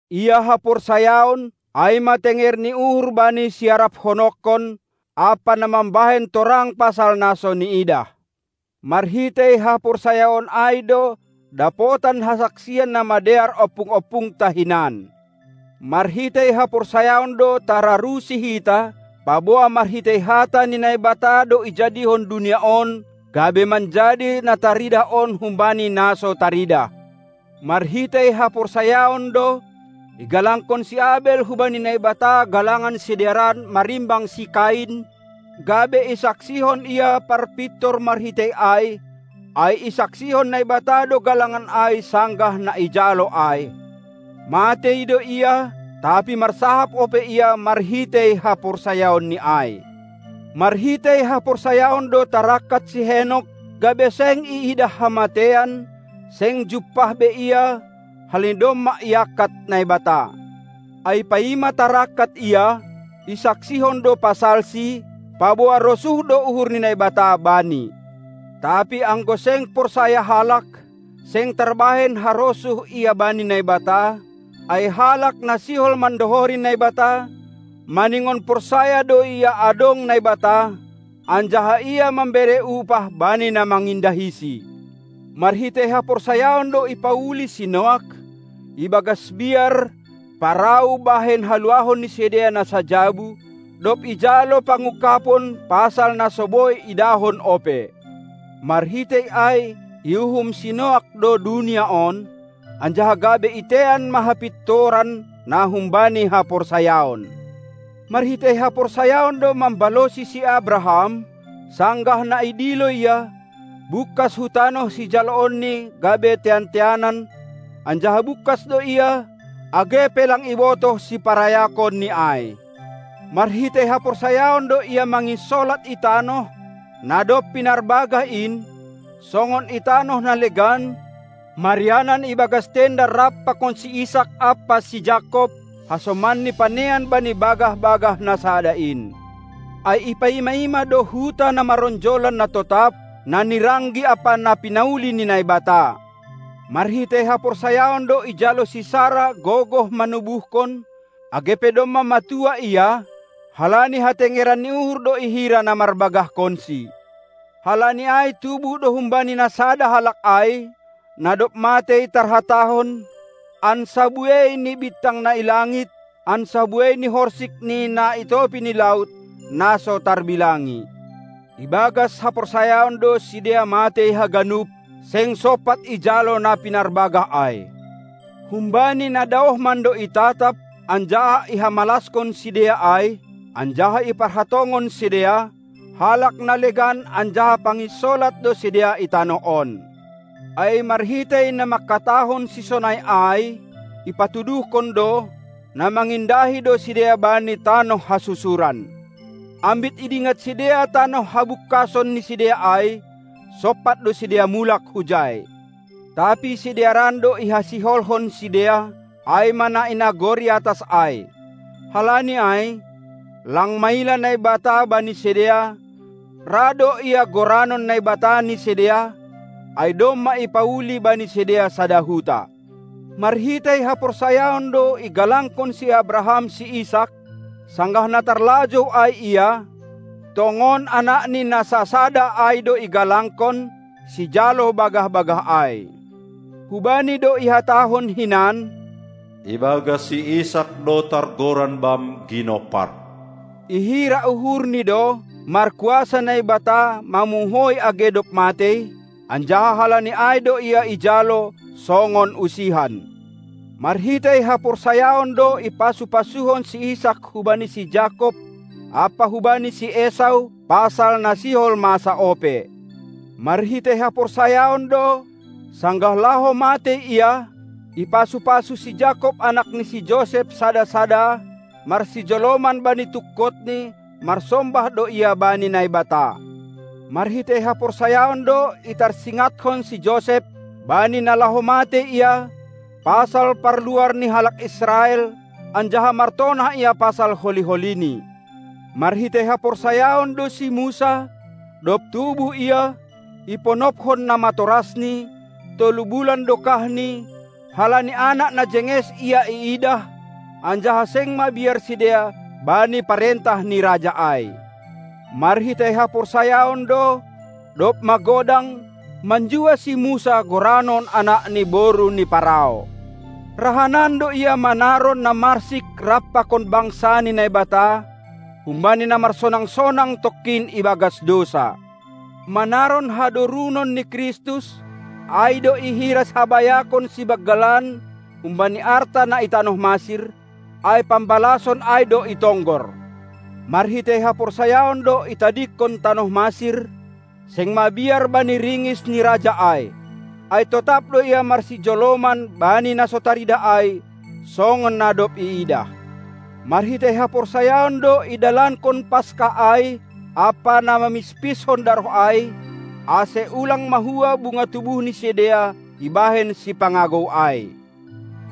Ia haporsayaon, ai ma tenger ni uhur bani siaraphononkon, ampa na mambahen torang pasal na so niidah. Marhitei haporsayaon ai do dapotan hasaksian na madear ompung-ompungta hinan. Marhitei haporsayaon do tararusi hita, paboa marhitei hata ni Naibata do ijadihon dunia on, gabe manjadi na taridah on humbani na so taridah. Marhitei haporsayaon do igalangkon si Abel hubani Naibata galangan sidearan marimbang si Kain, gabe isaksihon ia parpintor marhitei ai, ai isaksihon Naibata do galangan ai sanggah na ijalo ai; matei do ia, tapi marsahap ope ia marhitei haporsayaonni ai. Marhitei haporsayaon do tarangkat si Henok, gabe seng iidah hamateian; seng jumpah be ia, halani domma iangkat Naibata. Ai paima tarangkat ia, isaksihon do pasalsi, paboa rosuh do uhur ni Naibata bani. Tapi anggo seng porsaya halak, seng tarbahen harosuh ia bani Naibata, ai halak na sihol mandohori Naibata, maningon porsaya do ia adong Naibata, anjaha Ia mambere upah bani na mangindahiSi. Marhitei haporsayaon do ipauli si Noak ibagas biar parau bahen haluahon ni sidea na sajabu, dob ijalo pangungkabon pasal na so boi idahon ope; marhitei ai iuhum si Noak do dunia on, anjaha gabe itean ma hapintoran na humbani haporsayaon. Marhitei haporsayaon do mambalosi si Abraham, sanggah na idilo ia, bungkas hu tanoh sijaloonni gabe tean-teanan; anjaha bungkas do ia, age pe lang ibotoh siparayakonni ai. Marhitei haporsayaon do ia manginsolat i tanoh, na dob pinarbagah in, songon i tanoh na legan, marianan ibagas tenda rap pakon si Isak ampa si Jakob, hasomanni panean bani bagah-bagah na sada in. Ai ipaima-ima do huta na maronjolan na totap, na niranggi ampa na pinauli ni Naibata. Marhitei haporsayaon do ijalo si Sara gogoh manubuhkon, age pe domma matua ia, halani hatengeran ni uhur do ihira na marbagahkonsi. Halani ai tubuh do humbani na sada halak ai, na dob matei tarhatahon, ansa buei ni bintang na i langit, ansa buei ni horsik ni na i topi ni laut, na so tarbilangi. Ibagas haporsayaon do sidea matei haganup, seng sompat ijalo na pinarbagah ai; humbani na daoh mando itatap anjaha ihamalaskon sidea ai, anjaha iparhatongon sidea: Halak na legan anjaha panginsolat do sidea i tanoh on. Ai marhitei na mangkatahon sisonai ai, ipatuduhkon do, na mangindahi do sidea bani tanoh hasusuran. Ambit idingat sidea tanoh habungkason ni sidea ai, sompat do sidea mulak hujai. Tapi sidearan do ihasiholhon sidea, ai ma na i nagori atas ai. Halani ai, lang maila Naibata bani sidea, ra do Ia goranon Naibata ni sidea, ai domma ipauli bani sidea sada huta. Marhitei haporsayaon do igalangkon si Abraham si Isak, sanggah na tarlajou ai ia, tongon anakni na sasada ai do igalangkon, sijalo bagah-bagah ai. Hubani do ihatahon hinan: Ibagas si Isak do targoran bam ginompar! Ihira uhurni do, markuasa Naibata mamuhoi age dob matei, anjaha halani ai do ia ijalo, songon usihan. Marhitei haporsayaon do ipasu-pasuhon si Isak hubani si Jakob ampa hubani si Esau pasal na sihol masa ope. Marhitei haporsayaon do, sanggah laho matei ia, ipasu-pasu si Jakob anak ni si Josep sada-sada; marsijoloman bani tungkotni marsombah do ia bani Naibata. Marhitei haporsayaon do itarsingathon si Josep, bani na laho matei ia, pasal parluar ni halak Israel, anjaha martonah ia pasal holi-holini. Marhitei haporsayaon do si Musa, dob tubuh ia, iponophon namatorasni, tolu bulan dokahni, halani anak na jenges ia iidah, anjaha seng mabiar sidea bani parentah ni raja ai. Marhitei haporsayaon do, dob magodang, manjua si Musa goranon anak ni boru ni Parao. Rahanan do ia manaron na marsik rap pakon bangsa ni Naibata, humbani na marsonang-sonang tongkin ibagas dousa. Manaron hadorunon ni Kristus, ai do ihira habayakon sibanggalan humbani arta na i tanoh Masir, ai pambalason ai do itonggor. Marhitei haporsayaon do itadingkon tanoh Masir, seng mabiar bani ringis ni raja ai; ai totap do ia marsijoloman bani na so taridah ai, songon na dob iidah. Marhitei haporsayaon do idalankon Paska ai ampa na mamispishon daroh ai, ase ulang mahua bunga tubuh ni sidea ibahen sipangagou ai.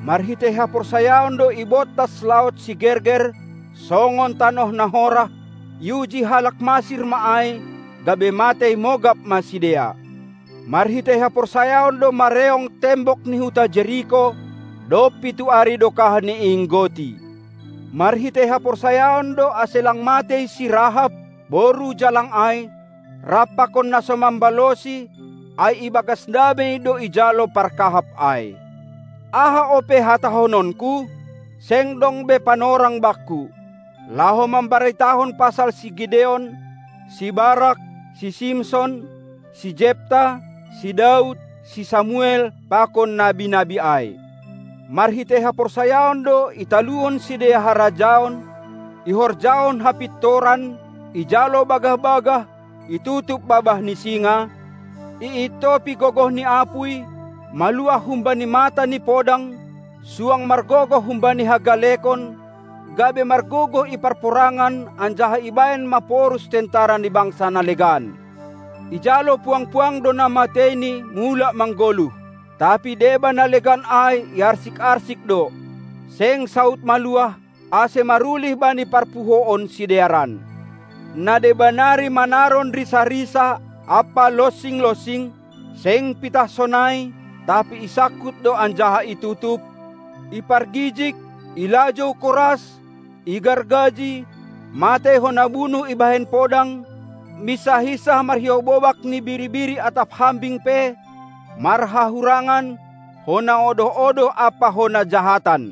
Marhitei haporsayaon do ibontas laut Sigerger songon tanoh na horah; iuji halak Masir ma ai, gabe matei mogap ma sidea. Marhitei haporsayaon do mareong tembok ni huta Jeriko, dob pitu ari dokahni iinggoti. Marhitei haporsayaon do ase lang matei si Rahab, boru jalang ai, rap pakon na so mambalosi; ai ibagas damei do ijalo parkahap ai. Aha ope hatahononku? Seng dong be panorang bakku, laho mambaritahon pasal si Gideon, si Barak, si Simson, si Jepta, si Daud, si Samuel pakon nabi-nabi ai. Marhitei haporsayaon do italuhon sidea harajaon, ihorjahon hapintoran, ijalo bagah-bagah, itutup babah ni singa, iintopi gogoh ni apuy, maluah humbani mata ni podang, suang margogoh humbani hagalekon, gabe margogoh i parporangan anjaha ibahen maporus tentara ni bangsa na legan. Ijalo puang-puang do na mateini mulak manggoluh. Tapi deba na legan ai iarsik-arsik do, seng saud maluah, ase marulih bani parpuhoon sidearan. Na deba nari manaron risa-risa ampa lonsing-lonsing, seng pitah sonai, tapi isangkut do anjaha itutup, ipargijig, ilajou koras, igargaji, matei hona bunuh ibahen podang, minsah-insah marhiou bobak ni biri-biri atap hambing pe, marhahurangan, hona odoh-odoh ampa hona jahatan.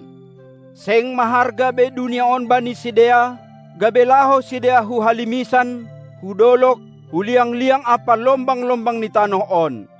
Seng maharga be dunia on bani sidea, gabe laho sidea hu halimisan, hu dolog, hu liang-liang ampa lombang-lombang ni tanoh on.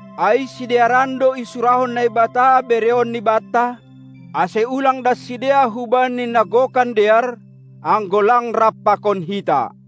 ai sidearan do isurahon Naibata bereonni banta, ase ulang das sidea hubani na gokan dear, anggo lang rap pakon hita.